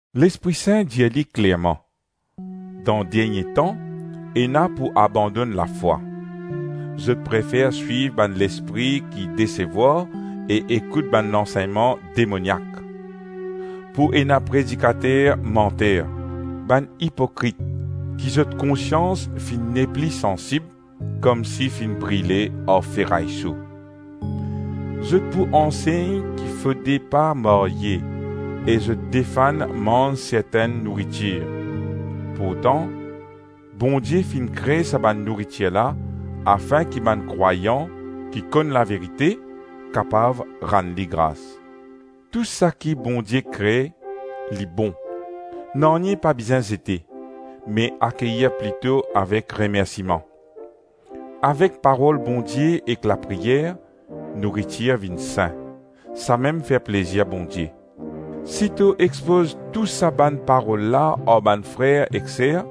Lespri Sin dir li klerman: dan dernie tan, ena pou abandonn lafwa. Zot prefer swiv bann lespri ki desevwar e ekout bann lansegnman demoniak. Pou ena predikater manter, bann ipokrit ki zot konsians finn nepli sansib komsi finn brile ar feray so. Zot pou ansegn ki fode pa marye, e zot defann manz sertenn nouritir. Pourtan Bondie finn kre sa bann nouritir la afin ki bann krwayan ki konn laverite kapav rann li gras. Tou saki Bondie kre, li bon. Nanye pa bizin zete, me akeyir plito avek remersiman. Avek parol Bondie ek lapriyer, nouritir vinn sin; samem fer plezir Bondie. Si to expoz tou sa bann parol la ar bann frer ek ser,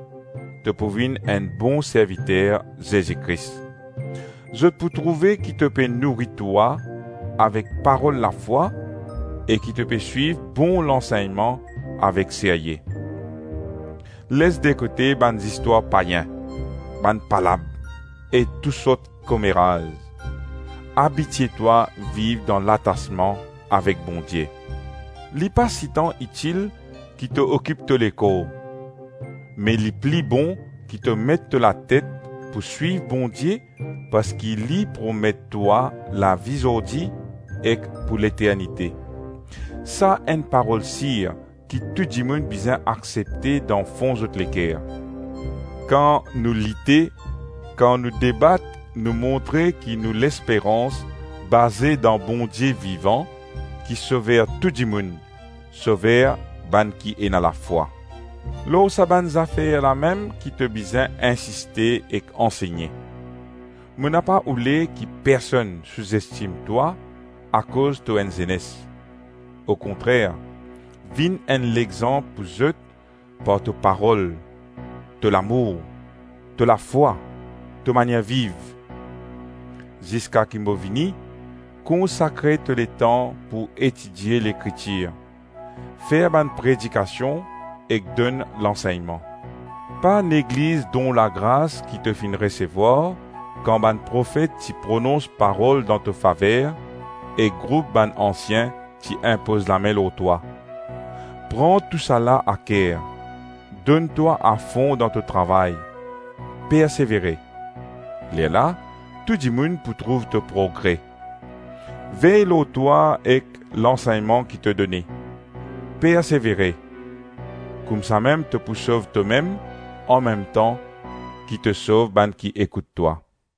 to pou vinn enn bon serviter Zezi Kris. Zot pou trouve ki to pe nouri twa avek parol lafwa e ki to pe swiv bon lansegnman avek serye. Les dekote bann zistwar payin, bann palab e tou sort komeraz. Abitie twa viv dan latasman avek Bondie. Li pa sitan itil ki to okip to lekor, me li pli bon ki to met to latet pou swiv Bondie parski li promet twa lavi zordi ek pou leternite. Sa enn parol sir ki tou dimoun bizin aksepte dan fon zot leker. Kan nou lite, kan nou debat nou montre ki nou lesperans baze dan Bondie vivan ki Sover tou dimoun, Sover bann ki ena lafwa. Lor sa bann zafer lamem ki to bizin insiste ek ansegne. Mo napa oule ki personn souzestim twa akoz to enn zenes. Okontrer, vinn enn lexanp pou zot par to parol, to lamour, to lafwa, to manier viv. Ziska ki mo vini, konsakre to letan pou etidie Lekritir, fer bann predikasion ek donn lansegnman. Pa negliz don lagras ki to finn resevwar kan bann profet ti pronons parol dan to faver e group bann ansien ti inpoz lame lor twa. Pran tousala aker, donn twa afon dan to travay, persevere. Lerla, tou dimoun pou trouv to progre. Vey lor twa ek lansegnman ki to done. Persevere. Koumsamem to pou sov tomem anmemtan ki to sov bann ki ekout twa.